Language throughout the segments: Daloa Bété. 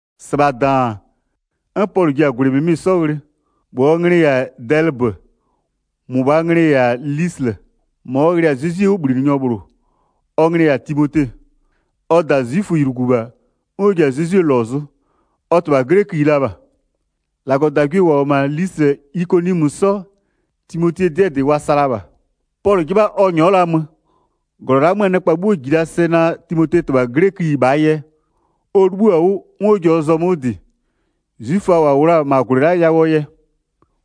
1-Sɩbha -daan, 'n Pɔlʋ ji-a -gwlɩ -mɩmɩ 'sɔ ghlɩ, -bhlʋɔ nglɩ -yɛ-a Dɛlɩbö, -mʋbhaa nglɩ -yɛ-a Lislɩ. -Ma ɔ ghlɩ-a Zezwie 'wʋbhlinɩnyɔ -bhlʋ. Ɔ nglɩ -yɛ-a Timote. Ɔ -da 'zwiföylugu -bha, 'n ɔ ji-a Zezwie -lɔ zʋ, ɔ -tɩbha 'glɛköyi la -bha. 2-Lagɔdagwie -wa -wʋ-ɔ -ma Lislɩ -yɛ Ikoniɔmö 'sɔ, Timotee 'dɩɛ -dɩ wa sa la -bha. Pɔlʋ 'jɩbha ɔ -nyɔɔ 'yɛ la mö. -Glɔ la'a 'möö nɩkpa 'bhuo -ji la sɛ naa Timotee -tɩbha 'glɛköyi -bhaa yɛ, ɔ 'libhïɔ-a 'wʋ, 'n ɔ ji-a ɔ zɔmö 'wʋ -dɩ, 'zwiföa -wa -wʋ la-a -ma -gwlɩ la'a yawʋɔ yɛ.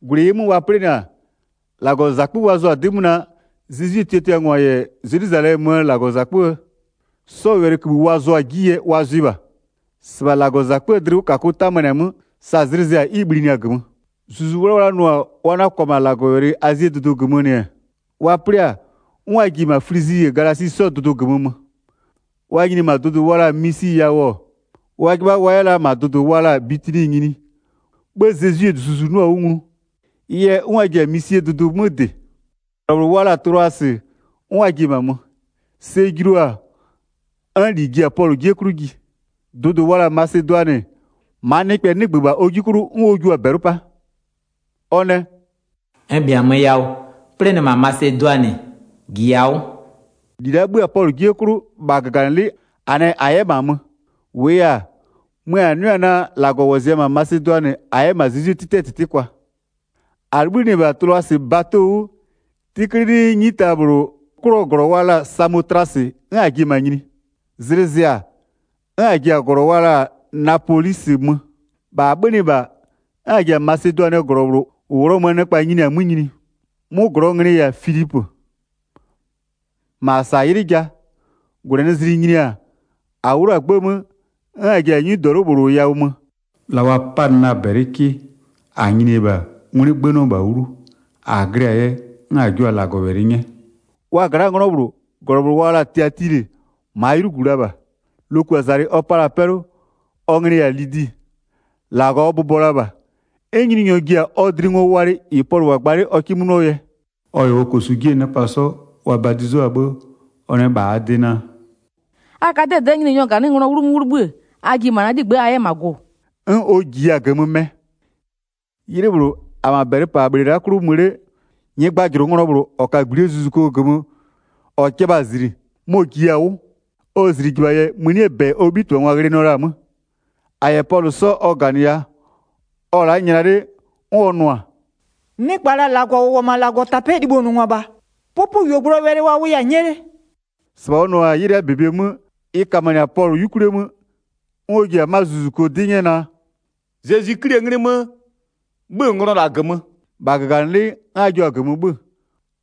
4-Gwlɩ -ɩɩ 'mö wa 'plɩnɩ-a, -Lagɔzakpö wa zʋ-a 'dɩ 'mö naa, Zezwie tiatiangwa -yɛ Zelwizalɛmöö -Lagɔzakpöö 'yuganɩngwa 'sɔɔ wɛlɩkïbhï wa zʋa-a 'ji yɛ, wa zʋɩ -bha. 5-Sɩbha -Lagɔzakpöö dlɩwʋkakʋ tamanɩ-a 'mö, sa zlɩ zɩ-a 'n ɩ bhlinɩ-a -gömö. Zuzu 'Wlawla nʋ-a wa 'na-a kwa -ma Azie dʋdʋ -gömö -Lagɔwɛlɩ -nɩ-ɛ, wa 'plɩ-a, 'n wa ji-e -ma Flizi -yɛ Galasi 'sɔɔ dʋdʋɩ -gömö mö. Wa nyini-e -ma dʋdʋ wa la-a Misi yawʋ-ɔ, wa 'jɩbha wa 'yɛ la -ma dʋdʋ wa la-a Bitini nyini, 'bhë Zezwie Zuzu 'nʋa-a 'wʋ nglu. Ɩ yɛ, 'n wa ji-a Misie dʋdʋ 'mö -dɩ. -Glɔ -bhlʋ wa la-a Tlʋasɩ, 'n wa ji-e -ma mö. Sɛ julu-a, 'n -li ji-a Pɔlʋ 'jie 'klʋ ji. Dʋdʋ wa la-a Masedʋanɩ, -maa nɩkpɛ 'nɩgbö -bha ɔ 'ji 'klʋ 'n ɔ jio-a -bɛlɩ 'pa. Ɔ nɛ: “N -bhiamö yawʋ 'plɩnɩ -ma Masedʋanɩ, -jiya 'wʋ.” 10-Li la'a 'bhö-a Pɔlʋ 'jie 'klʋ, -bha -gaganɩlɩ'ɩ -a nɛ -a 'yɛ -ma mö. -Wʋʋ yɛ-a, mö -a 'nʋɩ-a naa, -Lagɔ -wɔzɩya-a -ma Masedʋanɩ -a 'yɛ -ma Zezwie 'tɩtɩɛ -tɩtɩ kwa. Pɔlʋngwa yɛ -glɔ wa la-a Filipö nyini 11-A 'libhïnɩ-ɛ -bha Tlʋasɩ bato 'wʋ, 'tɩklɩlɩɩ, 'nyita -bhlʋ 'klʋɔ -glɔ wa la-a Samotlasɩ, 'n -a ji-e -ma nyini. Zlɩ zɩ-a, 'n -a ji-a -glɔ wa la-a Napolisɩ mö. 12-Bha -a 'bhönɩ -bha, 'n -a ji-a Masedʋanɩɛ -glɔ -bhlʋ -ʋ Ghlɔmöö nɩkpa nyini-a 'mö nyini. 'Mʋ -glɔɔ nglɩ-ɩ -yɛ-a Filipö. -Ma -a -sa-a 'ylɩ ja. 13-Gwlɛnɩzlɩ nyini-a -a 'wlʋ-a 'gbë 'mö, 'n -a ji-a 'nyidɔlʋ -bhlʋ yawʋ mö, la wa 'panɩ la-a -bɛlɩ 'kɩ, -a nyini-e -bha, 'ngwlɩ 'gbënɩɔ -bha 'wlu. -A glɩ-a yɛ, 'n -a jua-a -Lagɔwɛlɩ 'nyɛ. 14Wa gla'aa 'nglɔ -bhlʋ, -glɔ -bhlʋ wa la-a Tiatilɩ -maa 'ylugu la -bha. Lokuazalɩ ɔ pa la-a 'pɛlʋ, ɔ nglɩ-ɩ -yɛ-a Lidi, -Lagɔ ɔ bʋbɔ la -bha. 'N Nyininyɔ ji-a ɔ dlɩ ngo walɩ -ɩ Pɔlʋ -wʋ-a gba 'le ɔ 'kɩ 'mö 'nʋɔ yɛ. 15Ɔ -yɛ ɔ -kosu 'jie nɩkpa 'sɔ, wa badizʋa-a 'bhë, ɔ nɛ -bha -aa de naa: “A ka'a 'dɛdɛ'ɛ Nyininyɔɔ -ganɩnglɔ wlumö 'wʋ 'libhï, a ji -ma na 'ligbë'ë a 'yɛ -ma gʋ-ʋ.” 'N ɔ -jiya-a -gömö mɛ. Wa yɛ Pɔlʋ -yɛ Silasɩ 'sɔ -die 'mö 'pa 16'Ylɩ -bhlʋ, -a-a -ma -bɛlɩpanɩbhle la'aa 'klʋ mö 'le, nyɩgbajʋlʋnglɔ -bhlʋ -ɔ ka-a -gblie zuzuko -gömö -ɔ jɩbha-a -zli, mɔ-ɔ -jiya-a 'wʋ. Ɔ -zlijɩbha yɛ, mënie -bɛ ɔ 'bhitɩbhangwa ghlɩnɩɔ la-a 'mö. 17-A -yɛ Pɔlʋ 'sɔ ɔ -ganɩya, ɔ-ɔ la'a nyla 'le 'n ɔ nʋ-a: “Nɩkpa -la -Lagɔ -ʋ -wʋ-ɔ -ma -Lagɔtapɛ'ɛɛ libhonʋngwa -bha! 'Pʋpʋyuogblʋɔ wɛlɩ wa wʋya-a 'nyɛ 'le!” 18-Sɩbha ɔ nʋnʋ-a 'ylɩɛ -bebe 'mö. Ɩ kamanɩ-a Pɔlʋ 'yukwlie 'mö, 'n ɔ ji-a 'ma zuzuko 'dɩ 'nyɛ naa: “Zezwi 'Klie 'nglɩ 'mö, 'bhö-ö nglɔ -la -gömö.” -Bha -gaganɩlɩ'ɩ 'n a jio-a -gömö 'bhö-ö.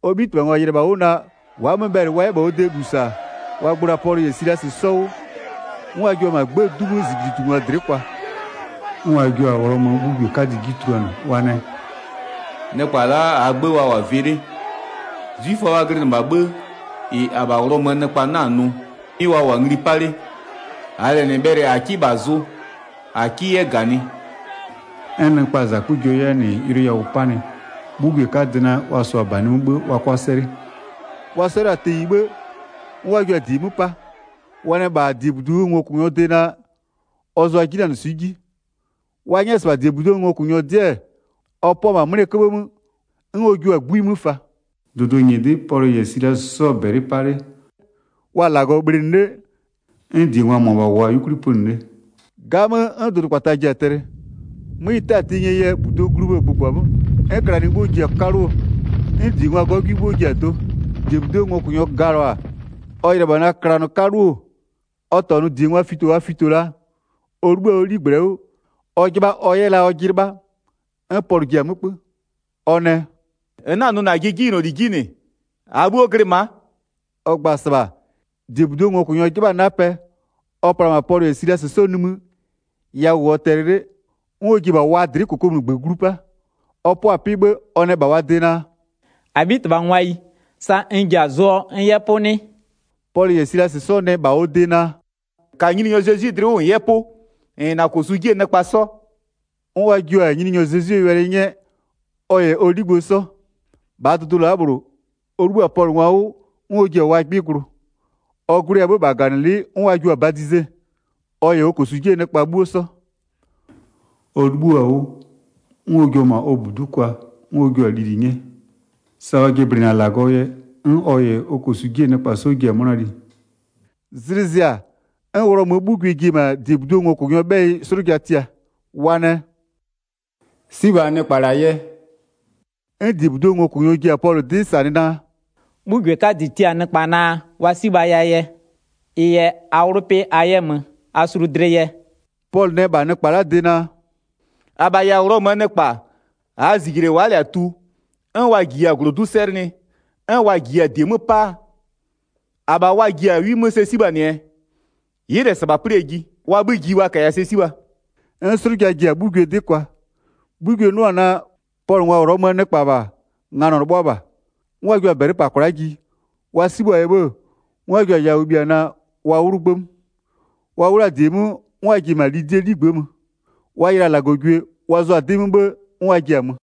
19Ɔ 'bhitɩbhangwa yɩlɩ-ɛ -bha 'wʋ naa, wa'a-a 'mö bhɛlɩ wa 'yɛ -bha ɔ de -lu -sa-a, wa gblo-a Pɔlʋ -yɛ Silasɩ 'sɔ 'wʋ, 'n wa jua-a -ma 'gbëë 'du 'mö -zijlitungwa dlɩ'ɩ kwa. 20'N wa jua-a Ghlɔmöö 'bhugwie 'kadɩ 'ji tuluanɩ, wa nɛ: “Nɩkpa la'a -aa 'gbë wa -wʋ-a vɩ 'le. 21'Zwiföa wa glɩnɩ -bha, 'bhë -ɩ -abha Ghlɔmöö nɩkpa 'na-a nʋ, 'mɩ wa -wʋ-a ngli 'pa 'le, -aa lɛ -nɩ bhɛlɩ a 'kɩ -bha -zʋ a 'kɩ 'yɛ -ganɩ.” 22'N nɩkpaa -zakpa jua 'yɛ-a -nɩ yʋlʋ yawʋ 'panɩ. 'Bhugwie 'kadɩ nɛ wa -sʋa -banɩ 'mö 'bhë wa 'kʋa 'sɛlɩ. 23Wa 'sɛlʋa-a tenyi 'bhë, 'n wa jua-a -die 'mö 'pa. Wa nɛ -bha -diebuduo ngokʋnyɔɔ de naa, ɔ zʋʋa 'jinanɩswɩ'ɩ 'ji. 24Wa 'nyɛ-ɛ -sɩbha -diebuduo ngokʋnyɔ 'dɩ-ɛ, ɔ 'pʋa-a -ma 'mlɩɛ 'köbhë 'mö, 'n ɔ jua-a 'gbui 'mö fa. -Lagɔ yɛ Pɔlʋngwa 'kpɔ -dɩ 25Dʋdʋ -nyɩdɩ'ɩ Pɔlʋ -yɛ Silasɩ 'sɔ-ɔ -bɛlɩ 'pa 'le, wa-a -Lagɔ bhlɩnɩ 'le, 'n -diengwa -mʋabha -wʋʋa-a 'yukwli pönɩ 'le. 26'Gamö, 'n dʋdʋkpata ji-a tɛlɩ. 'Mö ɩ 'tɛɛ-a tenyie yɛ -buduo gluo bhë-ë gbʋgbɔ-a 'mö, 'n klanɩ 'bhuo ji-a 'kaluo, 'n -diengwaa 'gɔgwɩ 'bhuo ji-a do. 27-Diebuduo ngokʋnyɔ galɔ-a, ɔ yɩlɩ-ɛ -bha naa klanɩ 'kaluo-o, ɔ -tɔnʋ -diengwa fito wa fito la. Ɔ 'libhï-a ɔ 'ligblɛ 'wʋ, ɔ 'jɩbha ɔ 'yɛ la ɔjɩ 'lɩbha. 28'N Pɔlʋ ji-a 'mö 'kpö. Ɔ nɛ: “-N 'na-a nʋ -najɩ 'jinyloli 'ji -nɩ, -aa 'bhuo glɩ ma'a.” 29Ɔ gba-a -sɩbha, -diebuduo ngokʋnyɔ 'jɩbha-a 'napɛ, ɔ pla-a -ma Pɔlʋ -yɛ Silasɩ 'sɔ nimï, yawʋ -wʋɔ tɛlɩ 'le, 'n ɔ ji-e -bha wa dlɩ'ɩ -kokomunigbö glu 'pa. 30Ɔ 'pʋa-a 'pɩ 'bhë, ɔ nɛ -bha wa de naa: “-Abhitɩbhangwayi, sa n ji-a zʋɔ n 'yɛ 'pʋ 'nɩ?” 31Pɔlʋ -yɛ Silasɩ 'sɔ nɛ -bha ɔ de naa: “-Ka Nyininyɔ Zezwi dlɩ 'wʋ -n 'yɛ 'pʋ, -n -yɛ -na -kosu 'jie nɩkpa 'sɔ.” 32'N wa jio-a Nyininyɔ Zezwie wɛlɩ 'nyɛ ɔ -yɛ ɔ 'ligbë 'sɔ. 33-Bhaa dʋdʋ la'a -bhlʋ, ɔ 'libhï-a Pɔlʋngwa 'wʋ, 'n ɔ ji-a wa 'gbɩ glʋ. Ɔ glʋɩ-a 'bhë -bha -gaganɩlɩ'ɩ 'n wa jio-a badize, ɔ -yɛ ɔ -kosu 'jie nɩkpa 'bhuo 'sɔ. 34Ɔ 'libhua-a 'wʋ, 'n ɔ jua-a -ma ɔ -budu'u kwa, 'n ɔ jua-a lili 'nyɛ. Sa ɔ jɩblɩnɩ-a -Lagɔɔ yɛ, 'n ɔ -yɛ ɔ -kosu 'jie nɩkpa 'sɔ ji-a 'mʋna li. Wa yɛ Pɔlʋngwa -die 'mö -sa 35Zlɩ zɩ-a, 'n Ghlɔmöö 'bhugwie ji-e -ma -diebuduo ngokʋnyɔɔ 'bhɛyɩ 'slʋja tia, wa nɛ: “'Sibha nɩkpa -la yɛ.” 36'N -diebuduo ngokʋnyɔ ji-a Pɔlʋ 'dɩ -sanɩ naa: “'Bhugwie 'kadɩ tia-a nɩkpa naa, wa 'sibhaya yɛ. Ɩ yɛ a 'wlʋ 'pɩ a 'yɛ mö, a sulu dlɩ yɛ.” 37Pɔlʋ nɛ -bha nɩkpa la'aa de naa: “-Abha -yɛ-a Ghlɔmöö nɩkpa, -aa -zijle wa'a -lɛ-a tu, 'n wa -jiya-a -glodu'u 'sɛlɩnɩ, 'n wa -jiya-a -die 'mö 'pa-a, -abha wa ji-a 'wi 'mö sɛ 'sibhanɩɛɛ? Ɩ'ɩ -lɛ -sɩbha 'plɩɛ ji. Wa 'bhï ji wa -kaya sɛ 'sibha.” 38'N 'slʋja ji-a 'bhugwie 'dɩ kwa. 'Bhugwie 'nʋ-a naa, Pɔlʋngwa Ghlɔmöö nɩkpa -bha-a, nganɔ 'lɩbhʋa -bha. 39'N wa jua-a -bɛlɩ -pa kwla'a ji, wa 'sibhʋa-a yɛ 'bhë, 'n wa jua-a yawʋ bhia naa, wa 'wlʋ 'gbë 'mö. 40Wa 'wlʋ-a -die 'mö, 'n wa ji-e -ma Lidie 'ligbë'ë mö. Wa yɩlɩ-a -Lagɔgwie, wa zʋa-a 'dɩ 'mö 'bhë 'n wa ji-a mö.